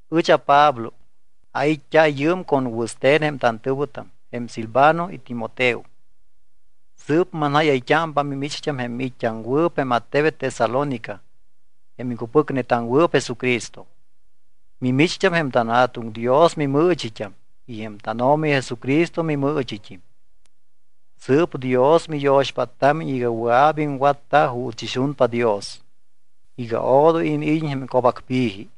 Ɨch aPablo. Ait́t́a yɨɨm con wɨste̱n jém tantɨ̱wɨtam jém Silvano y Timoteo. Sɨɨp manjáyayt́ámpa mimicht́am jém miit́t́aŋwɨɨp jém attebet Tesalónica jém iŋcupɨcnetaŋwɨɨp Jesucristo. Mimicht́am jém tanJa̱tuŋ Dios mimɨɨchit́am y jém tánO̱mi Jesucristo mimɨɨchit́im. Sɨɨp Dios miyo̱xpáttámiñ iga wɨa̱p iŋwatta juuts ixunpa Dios, iga odoy iniid́iñ jém co̱bacpi̱ji.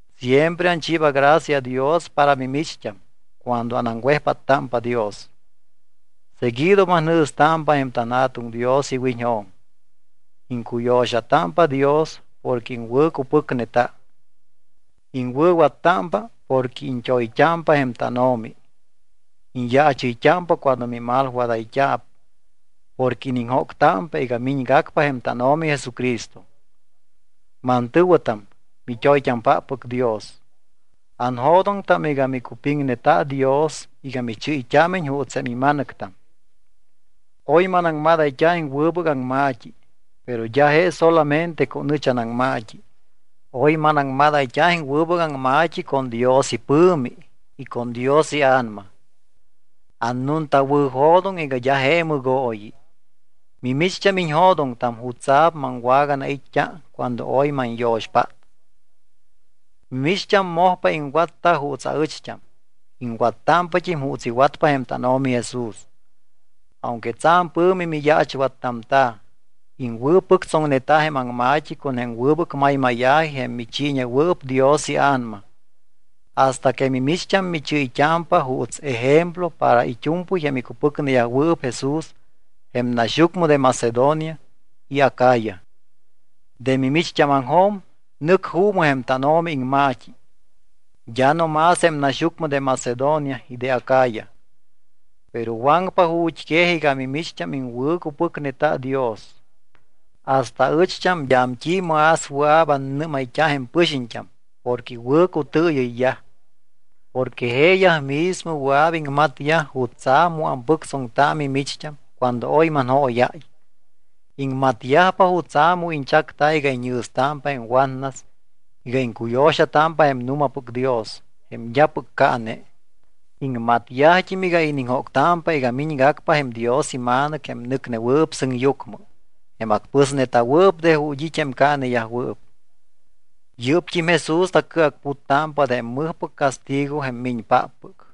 Siempre anchiiba gracia Dios para mimicht́am cuando anaŋwejpáttámpa Dios. Seguido manjɨ̱stámpa jém tanJa̱tuŋ Dios iwiñjo̱m. Iŋcuyo̱xatámpa Dios porque iŋwɨ̱cupɨcneta. Iŋwɨ̱wattámpa porque iñt́oyt́ámpa jém tánO̱mi. Iñyaachɨyt́ámpa cuando mimalwadayt́a̱p porque iniŋjóctámpa iga miñgacpa jém tánO̱mi Jesucristo. Mantɨ̱wɨtam, mit́oyt́ampáppɨc Dios, anjo̱doŋtam iga micupiŋneta Dios iga michɨ́yt́ámiñ juuts jém ima̱nɨctam. Oy manaŋmadayt́a jém wɨbɨc aŋma̱t́i, pero d́a je solamente con ɨch anaŋma̱t́i. Oy manaŋmadayt́a jém wɨbɨc aŋma̱t́i con Dios ipɨ̱mi y con Dios iA̱nama. Annuntawɨ̱jo̱doŋ iga d́a je mɨgooyi. Mimicht́am iñjo̱doŋtam jutsa̱p maŋwaganait́t́a cuando oy manyo̱xpát. Mimicht́am mojpa iŋwatta juuts aɨcht́am, iŋwattámpat́im juuts iwatpa jém tánO̱mi Jesús. Aunque tsa̱m pɨ̱mi miyaachwattamta̱, iŋwɨ̱pɨctsoŋneta jém aŋma̱t́i con jém wɨbɨc maymáya̱ji jém michiiñewɨɨp Dios iA̱nama. Hasta que mimicht́am michɨ́yt́ámpa juuts ejemplo para it́u̱mpɨy jém icupɨcneyajwɨɨp Jesús jém naxyucmɨ de Macedonia y Acaya. De mimicht́ámaŋjo̱m nɨc juumɨ jém tánO̱mi iŋma̱t́i. D́a no más jém naxyucmɨ de Macedonia y de Acaya, pero waŋpa ju̱t́quej iga mimicht́am iŋwɨ̱cupɨcneta Dios. Hasta aɨcht́am d́am t́i más wɨa̱p annɨ́mayt́a jém pɨxiñt́am porque iwɨ̱cutɨɨyɨyyaj. Porque jeeyaj mismo wɨa̱p iŋmatyaj jutsa̱p mu ampɨctsoŋta mimicht́am cuando oy manjóyáy. Iŋmatyajpa jutsa̱ mu iñchacta iga iñjɨ̱stámpa jém watnas iga iŋcuyo̱xatámpa jém nu̱mapɨc Dios, jém d́apɨc caane. Iŋmatyajt́im iga iniŋjóctámpa iga miñgacpa jém Dios iMa̱nɨc jém nɨcnewɨɨp sɨŋyucmɨ, jém acpɨsneta̱wɨɨp de ju̱t́ it́ jém caaneyajwɨɨp. Yɨ́pt́im Jesús tacɨacputtámpa de jém mɨjpɨc castigo jém miñpáppɨc.